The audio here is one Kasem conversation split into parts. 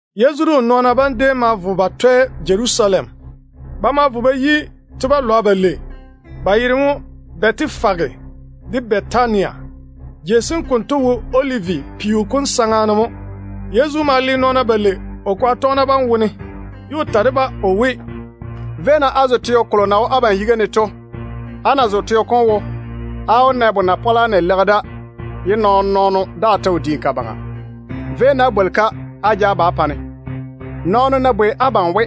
Yezu de o nɔɔna bam déem ma vo ba twɛ Jerusalem. Ba ma vo ba yi te-balwa balei, ba yera mo Bɛtefage de Bɛtania. Jei sem konto wo Olivi peo kom saŋa ne mo. Yezu ma le nɔɔna balei o kwaga tɔgena bam wone, ye o ta de-ba o we, “Véi-na á zo teo kolo na wo abam yiga ne to. Á ná zo teo kom wo, á wó na bona-pɔla na leigi da ye nɔɔn-nɔɔno daa ta wo diini ka baŋa. Véi-na á bwoli-ka á ja ba á pa-ne. Nɔɔno ná bwei abam we,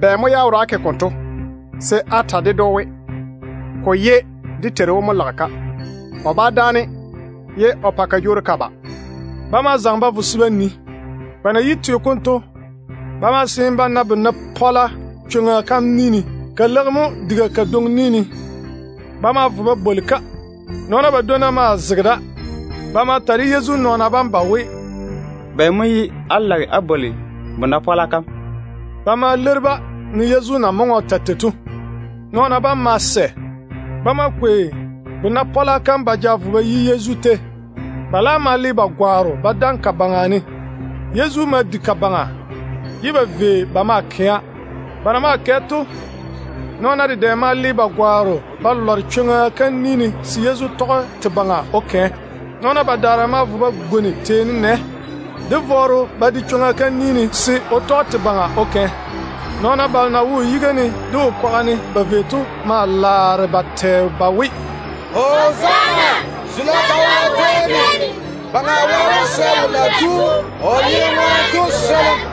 ‘Bɛ mo ye á wora á ke konto?’ se á ta ded‑o we, ‘Ko ye dé Teiru wom mo lage-ka. O bá dáane ye o pa ka jwoori ka ba.’” Ba ma zaŋe ba vo se ba nii. Ba na yi teo kom to, ba ma seene ba na bona-pɔla chwoŋa kam ni ne. Ka leigi mo diga kadwoŋi ni ne. Ba ma vo ba bwoli-ka. Nɔɔna badwonna maa zege da. Ba ma ta de Yezu nɔɔna bam ba we, “Bɛ mo ye á lage á bwoli bona-pɔla kam?” Ba ma leiri-ba ne Yezu na maŋe o ta tei to. Nɔɔna bam ma sɛ. Ba ma kwei bona-pɔla kam ba ja vo ba yi Yezu tei. Ba laam ma le ba gwaaro ba daŋe ka baŋa ne. Yezu ma di ka baŋa, ye ba vei ba maa kɛa. Ba na maa kɛ to, nɔɔna dedɛ ma le ba gwaaro ba lware chwoŋa kam ni ne se Yezu tɔge te baŋa o kɛ. Nɔɔna badaara ma vo ba gwoni teeni nɛ de vɔɔro ba de chwoŋa kam ni ne se o tɔge te baŋa o kɛ. Nɔɔna balo na wo o yiga ne de o kwaga ne ba vei to maa laare ba tɛ ba we: “Hozaana! Zula taa wo Wɛ tei ne! Baŋa Wɛ wó swɛ wolo na tu o yere ŋwaane to swolim.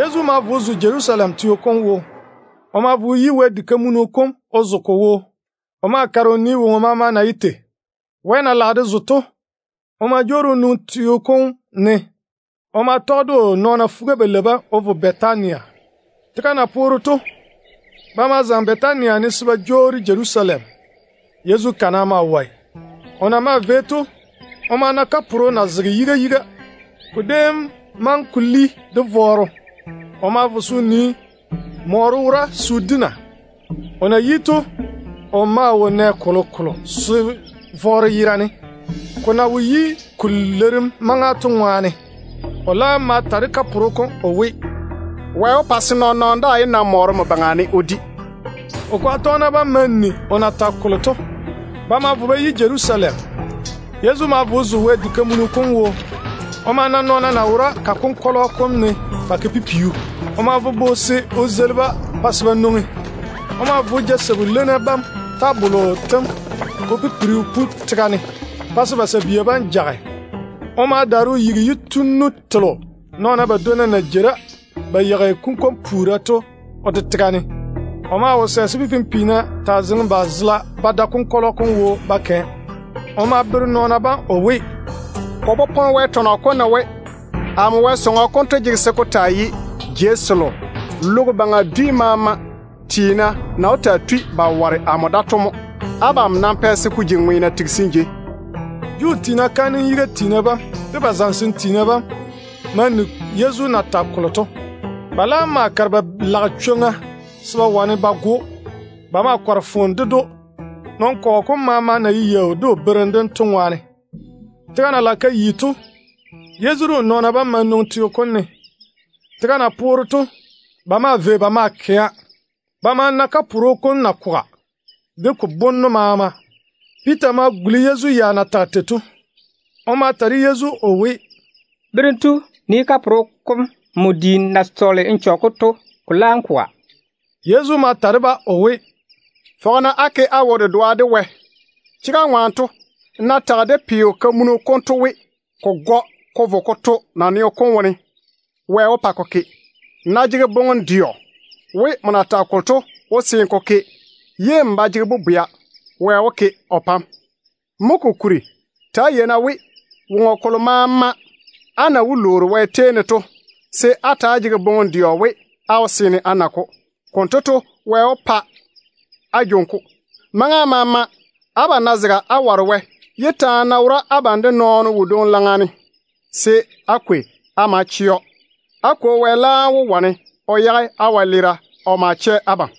Yezu ma vo o zo Jerusalem teo kom wo. O ma vo o yi Wɛ diga kam o zo ka wo. O ma kare o nii woŋo maama na ye tei. Wɛ na lage de zo to, o ma jwoori o nwoŋi teo kom ne. O ma tɔge de o nɔɔna fuga-balei bam o vo Bɛtania. Tega na poore to, ba ma zaŋe Bɛtania ne se ba jwoori Jerusalem. Yezu kana maa wɔe. Ba na maa vei to, o ma tole o na kaporo na zege yiga yiga. Ko déem maŋe ko li de vɔɔro. O ma vo se o nii mɔɔro wora se o di na. O na yi to, o maa wo nɛ kolokolo se vɔɔro yerane, ko na wo yi ko leirim maŋa to ŋwaane. O laam ma ta de kaporo kom o we, “Wɛ wó pa se nɔɔn-nɔɔno daa yé na mɔɔro nmo yuu ne o di.” O kwaga tɔgena bam ma ni o na tage kolo to. Ba ma vo ba yi Jerusalem. Yezu ma vo o zo Wɛ diga kam wo. O ma na nɔɔna na wora ka konkɔlɔ kom ne ba ke pipiu. O ma bobo se o zeili-ba se ba nwoŋi. O ma ja sabu-leinna bam tabollo tem o pipiri o pu tega ne pa se ba sabia bam jage. O ma daare o yigi yitunnu telo nɔɔna badwonna na jei da ba yeigi kunkwon-puura to o de tega ne. O maa wo sɛ se pipim-piina taa zeŋe ba zela ba tɔge konkɔlɔ kom wo ba kɛa. O ma bere nɔɔna bam o we, “Ko popone Wɛ tɔnɔ kom ne we, ‘Ba wó taa bwoi amo sɔŋɔ kom we, wara-jei mo na zege dwi maama ŋwaane.’ Abam nam pɛ se ko ji ŋweena tigisim jei.” Juu tiina kaanem yiga tiina bam de ba zamesem tiina bam ma ni Yezu na tage kolo to. Ba laam ma kare ba lage chwoŋa se ba wane ba go‑o. Ba ma kɔre foone ded‑o, nɔn-kɔgɔ kom maama na ye yaau de o berem dem to ŋwaane. Tega na lage ka yi to, Yezu de o nɔɔna bam ma nwoŋi teo kom ne. Tega na poore to, ba maa vei ba maa kɛa. Ba ma na kaporo kom na koga, de ko bonno maama. Piita ma guli Yezu ya na tage tei to. O ma ta de Yezu o we, “Berem tu, nii kaporo kom nmo diim na sɔɔle n chɔge-ko to. Ko laam koga.” Yezu ma ta de-ba o we, “Fɔge-na á ke á wo-dedoa de Wɛ. Chega ŋwaane to, nmo ná tage de peo-kamunu konto we, ko gɔ ko vo ko to naneo kom wone, Wɛ wó pa ko ke. Nmo ná jege boŋem-dɛɔ we nmo na tage kolo to wó seene ko ke, ye n ba jege bobwea, Wɛ wó ke o pa‑m. Mo kokuri, ta‑á yei-na we, woŋo kolo maama á na wó lwoori Wɛ tei ne to, se á ta‑á jege boŋem-dɛɔ we á wó seene á na-ko. Konto to, Wɛ wó pa á jwoŋi-ko. Maŋa maama abam ná zega á ware Wɛ, ye taane ná wora abam de nɔɔno wodwoŋi laŋa ne, se á kwei á ma chɛ‑o. Á Kwo Wɛ laam wó wane o yage á wɛleera o ma chɛ abam. [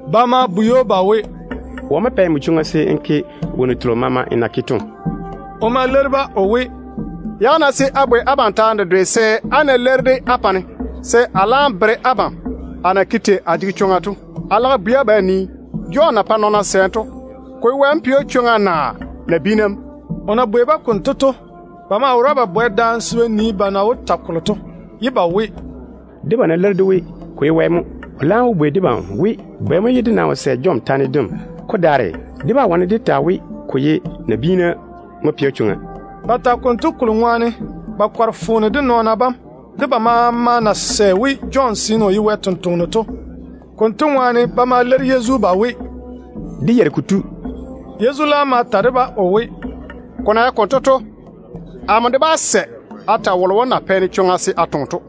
Ba ma bwei‑o ba we, “Wɔ mo pɛ nmo chwoŋa se n ke wonnu telo maama n na ke to?” O ma leiri-ba o we, “Yage-na se a bwei abam taane dedwe se, á ná leiri-de á pa-ne, se a laam bere abam a na ke tei a jege chwoŋa to. A lage a bwei abam a nii, Jɔn na pɛ nɔɔna sɛɛm to, ko ye Wɛ mo pɛ‑o chwoŋa naa nabiina mo?” O na bwei-ba konto to, ba maa wora ba bane daane se ba nii ba na wó ta kolo to, ye ba we, “Debam ná leiri dé we, ko ye Wɛ mo, o laam wó bwei debam we, bɛ mo ye dé nam wo sɛ Jɔn taane dem? Ko daare, dé bá wane dé ta we ko ye nabiina mo pɛ‑o chwoŋa.” Ba tage konto kolo ŋwaane ba kɔre foone de nɔɔna bam, de ba maama na sɛ we Jɔn seene o ye Wɛ sampwora to. Konto ŋwaane ba ma leiri Yezu ba we, “Dé yeiri kotu.” Yezu laam ma ta de-ba o we, “Ko na ye konto to, amo de nam bá ta wolo na pɛ-ne chwoŋa se a taa toŋe to.”